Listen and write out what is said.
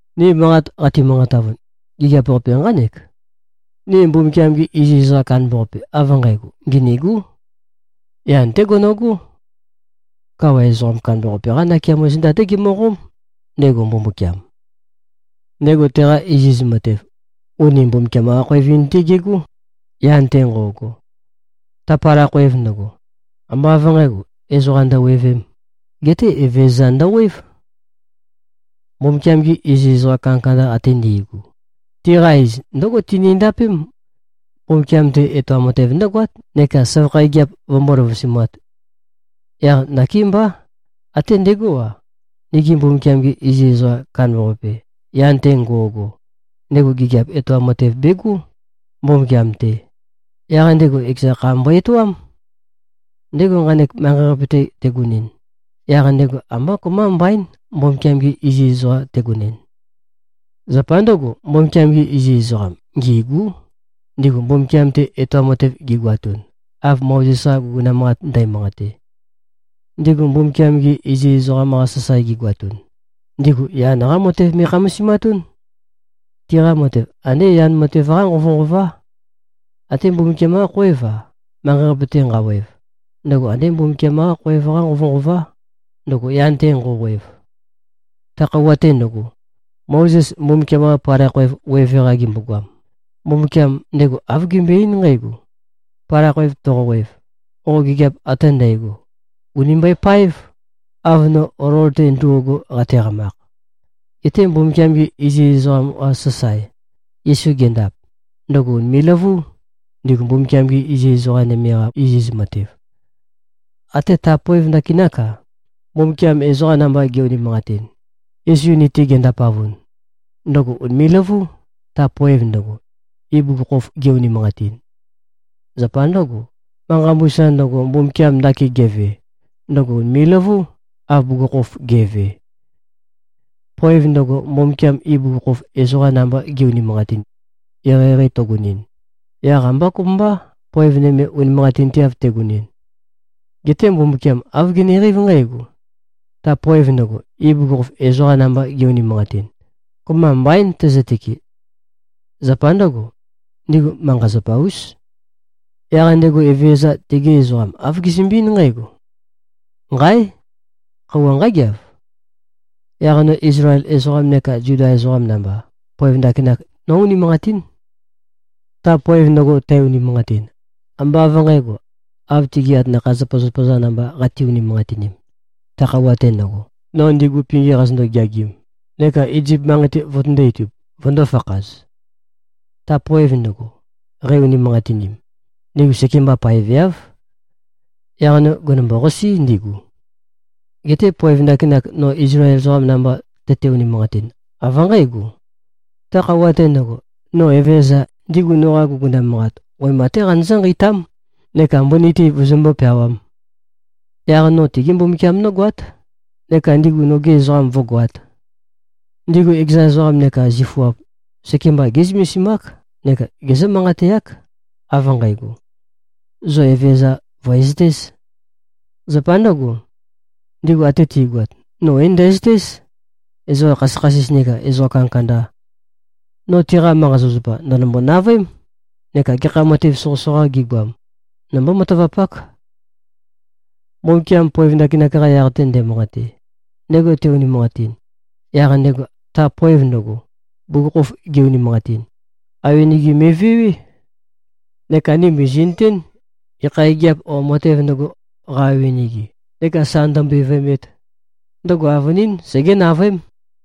Ni manqat qati-manqatavun, gigiap-qape nqánek: Ni Mbumbukiam-ge iziz ezoqam kandambaqape av nqægo, nginîgú. Yan-té gono꞉gó. Kawa ezoqam kandambaqape-qá nakeamo zenda-té gemøqóm, ndego Mbumbukiam. Ndego teqa iziz matev, uni Mbumbukiam-qa-khoev-in-té gegó, yan-te nqo꞉go. Ta palai khoev ndøgo, ambá av nqǣgo, ezoqa ndøwevēm, geté Evezøza ndøwév. Mbumbukiam-gi iziz ezoqa kandakanda ate ndi꞉gu, tiqa iz ndǿgo tinindapém: Mbumbukiam-te etoam matev ndǿgoát neka søvakha gigiap vømbó-løvusumāt. Yaq nakémbá, até ndegó-a, nigi Mbumbukiam-ge iziz ezoqa kandambaqape, yan-te ngo꞉go, ndego gigiap etoam matev begó, Mbumbukiam-te. Yaq ndego ekeza kha mbo-etoám. Ndego nqanek manqei-qape-te tegonɨn, yaq ndego ambá kopømba mbaín, Mbumbukiam-ge iziz ezoqam tegonɨn. Zapa ndǿgo, Mbumbukiam-gi iziz ezoqa ngîgú, ndigu Mbumbukiam-te etoam matev gigoatun, av Mozes-qa guguna manqat ndæmanqate. Ndigu Mbumbukiam-gi iziz ezoqam-qa sasae gigoatun, ndigu yan-qá matev me꞉khamasimatún. Tiqa matev andé yan matev-qá nqovønqová. Até Mbumbukiam-qá khoév-a, manqei-qape-te nqawev, ndøgo andé Mbumbukiam-qá khoev-qá nqovønqová, ndøgo yan-te nqo꞉wev. Ta khøuwa-te ndøgo, Mozes Mbumbukiam-qa palai khoev weve-qa gembogoam, Mbumbukiam ndego āv gembøe-eín nqǽgo, “Palai khoev toqowev, qo gigiap ate ndægo ùni mbøepáev, av no olol-te ndo꞉go, qateqamakh.” Geté Mbumbukiam-ge iziz ezoqam-qa sasae, Yesu gendap, ndøgo ùnime꞉-løvú, ndigu Mbumbukiam-gi iziz ezoqa nøme-qa iziz matev. Até ta poev ndakinák-a, Mbumbukiam ezoqa namba ge꞉-unimanqatin, Yesu ni-te gendapavun, ndøgo ùnime꞉-løvú, ta poev ndøgo, ibugukhokhof ge-unimanqatin. Zapa ndǿgo, manqa mbusa ndøgo, Mbumbukiam ndakin geve, ndøgo ùnime꞉-løvú, av bugukhokhof ge꞉ve. Poev ndøgo, Mbumbukiam ibugukhokhof ezoqa namba ge꞉-unimanqatin, eqeieqei tøgønɨn, yaq ambá kopømbá, poev nøme unimanqatinteav tegønɨn. Geté Mbumbukiam āv geneqeív nqǽgo: Ta poev ndøgo, ibugukhokhof ezoqa namba ge꞉-unimanqatin, kopømba mbaín tøzøtøke. Zapa ndǿgo, ndigu manqa-zapa-ús. Yaq ndego Evezøza, tegi ezoqam, āv gezømbe-eín nqǽgo, “Nqáe! Khøuwa nqágeav. Yaq no Izlael ezoqam neka Zuda ezoqam namba, poev ndakinak nó-unimanqatín. Ta poev ndøgo, tæ-unimanqatin, ambá av nqǣgo, av tigi atanakha-zapazapa-za namba qate-unimanqatin, ta khøuwa-te ndøgo, no ndigu pingi qazøndo-geagim neka Izip manqei-te vøtøndō-itub, vøndō-fakhaz. Ta poev ndøgo, qei-unimanqatinim, ndigu sekemba paeveáv. Yaq no gènømbo-qasí, ndigu. Geté poev ndakinak, no Izlael ezoqam namba tøte-unimanqatin, av nqǽgo: Ta khøuwa-te ndøgo, no Evezøza, ndigu noqa guguna manqat, wema-té qanøzǿ-nqeitám neka mbøni-te vøzømbó-peawām. Yaq no tigí Mbumbukiam nógoát neka ndigu nogi ezoqam vǿgoāt. Ndigu ekeza ezoqam neka zifuap, sekemba gé꞉zømesimák neka gezǿ-manqateák, av nqægo, ‘Zo Evezøza vø̀ezøtēz.’ Zapa ndǿgo, ndigu ate ti꞉goat, no é-ndæzøtéz, ezoqa khasøkhasis nekā ezoqa kandakanda. No tiqa manqa-zapazapa, ndø̀nømbo-navøém neka gekha matev soqøsoqā gigoam, nombó-matavapák.” Mbumbukiam poev ndakinak-qa yaq-te nde꞉manqate, ndego te-unimanqatin, yaq ndego ta poev ndøgo, bugukhokhof ge-unimanqatin, awenege me꞉vewé. Neka ni mìzi꞉nøtén, gekha gigiap o matēv ndøgo, qa-nqawønege neka sa ndømbevøemet, ndøgo avønín segé-navøém.